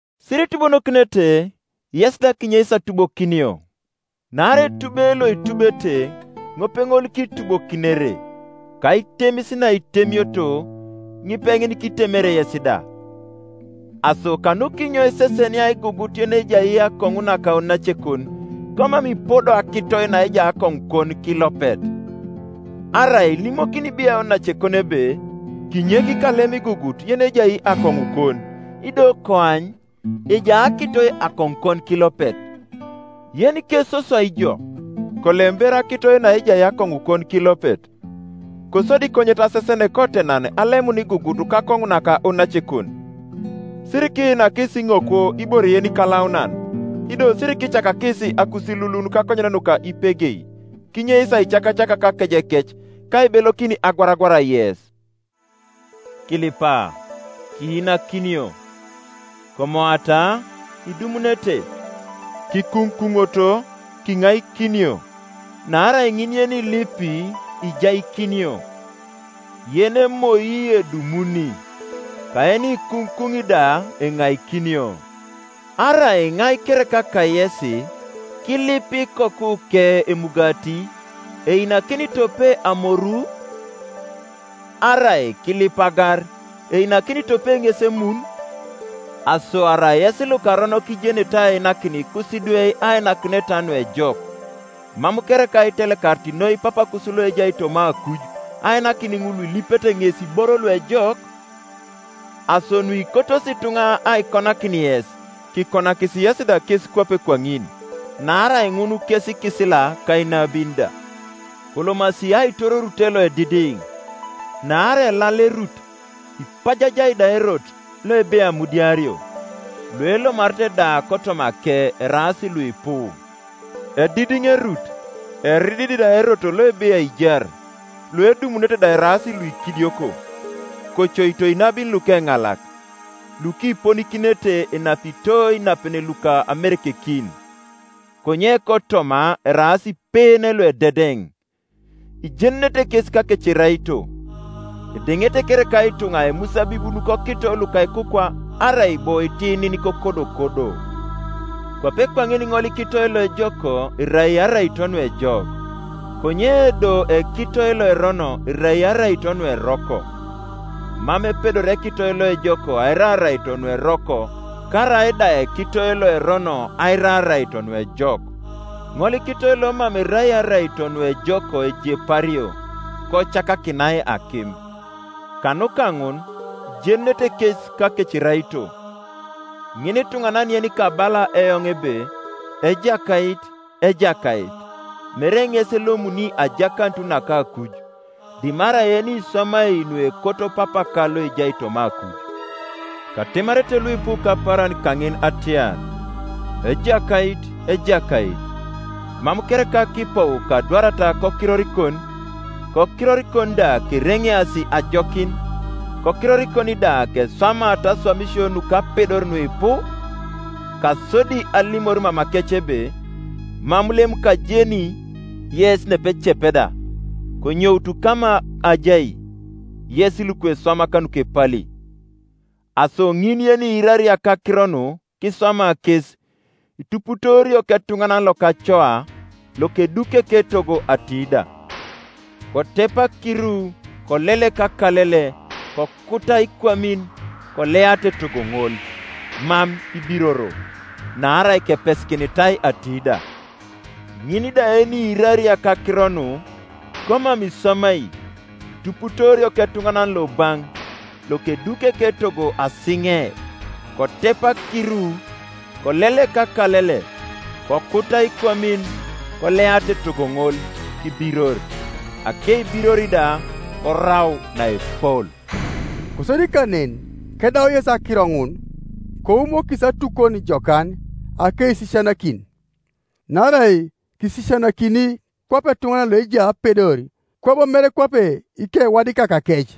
“Siritubonokinete, yes da kinyeis atubokinio. Naarai etube loitubete, ŋopeŋol kitubokinere; ka aitemis naitemioto, ŋipeŋin kitemere yes da, Aso kanukinyo isesenia igugut yenejai akoŋu naka onacekon, komam ipodo akitoi naejai akoŋukon kilopet? Arai ilimokini biai onacekon ebe, ‘Kinyek kalem igugut yenejai akoŋukon’; ido koany, ejai akitoi akoŋukon kilopet? Yenikesoswai ijo, kolem ber akitoi naejai akoŋukon kilopet; kosodi konyet asesen kotenan alemun igugut kakoŋu naka onacekon. “Sirikiinakis iŋokwo ibore yenikalaunan, ido sirikicakakis akusilulun kakonyen nuka ipegei, kinyeis aicakacak kakejekec, ka aibelokin agwaragwar yes. “Kilipa, kiinakinio; komoata, idumunete; kikuŋukuŋoto, kiŋaikinio. Naarai ŋin yenilipi ijaikinio; yenemoi edumuni; ka yenikuŋukuŋi da enaikinio. Arai iŋai kereka kayesi, kilip ikokuke emugati, einakini tope amoru? Arai kilip agar, einakini tope ŋes emun? Aso arai yes lukaronok ijenete ainakin ikusidwe ainakineta nuejok, mam kereka itelekarit noi Papakus loejai toma akuj ainakin ŋul Iuilipete ŋes iboro luejok? Aso nuikotosi ituŋa aikonakin yes, kikonakis yesi da kes kwape kwaŋin: naarai ŋun kes ikisila ka inabin da. “Kolomasi aitor orute loedidiŋ; naarai elal erut, ipajajai da erot, loebei amudiario, luelomarete da kotomake eraas luipu. Edidiŋ erut, eridid da erot loebei aijar, luedumunete da eraas luikidioko. “Kocoito inabin lukeŋalak, lukiponikinete enapito inapen luka amerekekin, konye kotoma eraas ipeen luededeŋ. Ijenunete kes kakeceraito. Edeŋete kereka ituŋa imusabibun kokito luka ikukwa, arai bo itinin kokodokodo? Kwape kwaŋin ŋolikitoi loejok erai araito nuejok; konye do ekitoi loerono erai araito nueroko. Mam epedori ekitoi loejok aira araito nueroko, karaida ekitoi loerono aira araito nuejok. Ŋolikitoi lomam erai araito nuejok ejepario, kocakakinai akim. Kanuka ŋun ijenunete kes kakeceraito. “Ŋinituŋanan yenikabala eoŋ ebe, ‘Ejakait, Ejakait,’ mere ŋes elomuni ajakanut naka akuj; dimarai yeniswamai nuekoto Papaka loejai toma akuj. Katemarete luipu kapaaran kaŋin atiar, ‘Ejakait, Ejakait, mam kereka kipou kadwarata kokirorikon, kokirorikon da kereŋeasi ajokin, kokirorikon da keswamata aswamisio nukapedor nuipu?’ Kasodi alimor mamakec ebe, ‘Mam lem kajeni yes nepecep da: konyoutu kama ajai, yes lukeswamak nukepali.’ “Aso ŋin yeniirari akakiro nu kiswama kes, ituputoorio ketuŋanan lokacoa, lokeduki eketogo atiida: kotep akiru, kolelek akalele, kokuta ikwamin, koleata etogo ŋol; mam ibiroro: naarai kepesikinitai atiida. Ŋin da yeniirari akakiro nu, komam iswamai, ituputoorio ketuŋanan lobaŋ, lokeduki eketogo asiŋe: kotep akiru, kolelek akalele, kokuta ikwamin, koleata etogo ŋol; kibiror; akeibiror da korau naepol.” Kosodi kanen, kedau Yesu akiro ŋun, koumokis atukon jokan akeisisianakin. Naarai kisisianakini kwape etuŋanan loejai apedor, kwabo mere kwape ikewadikakakec.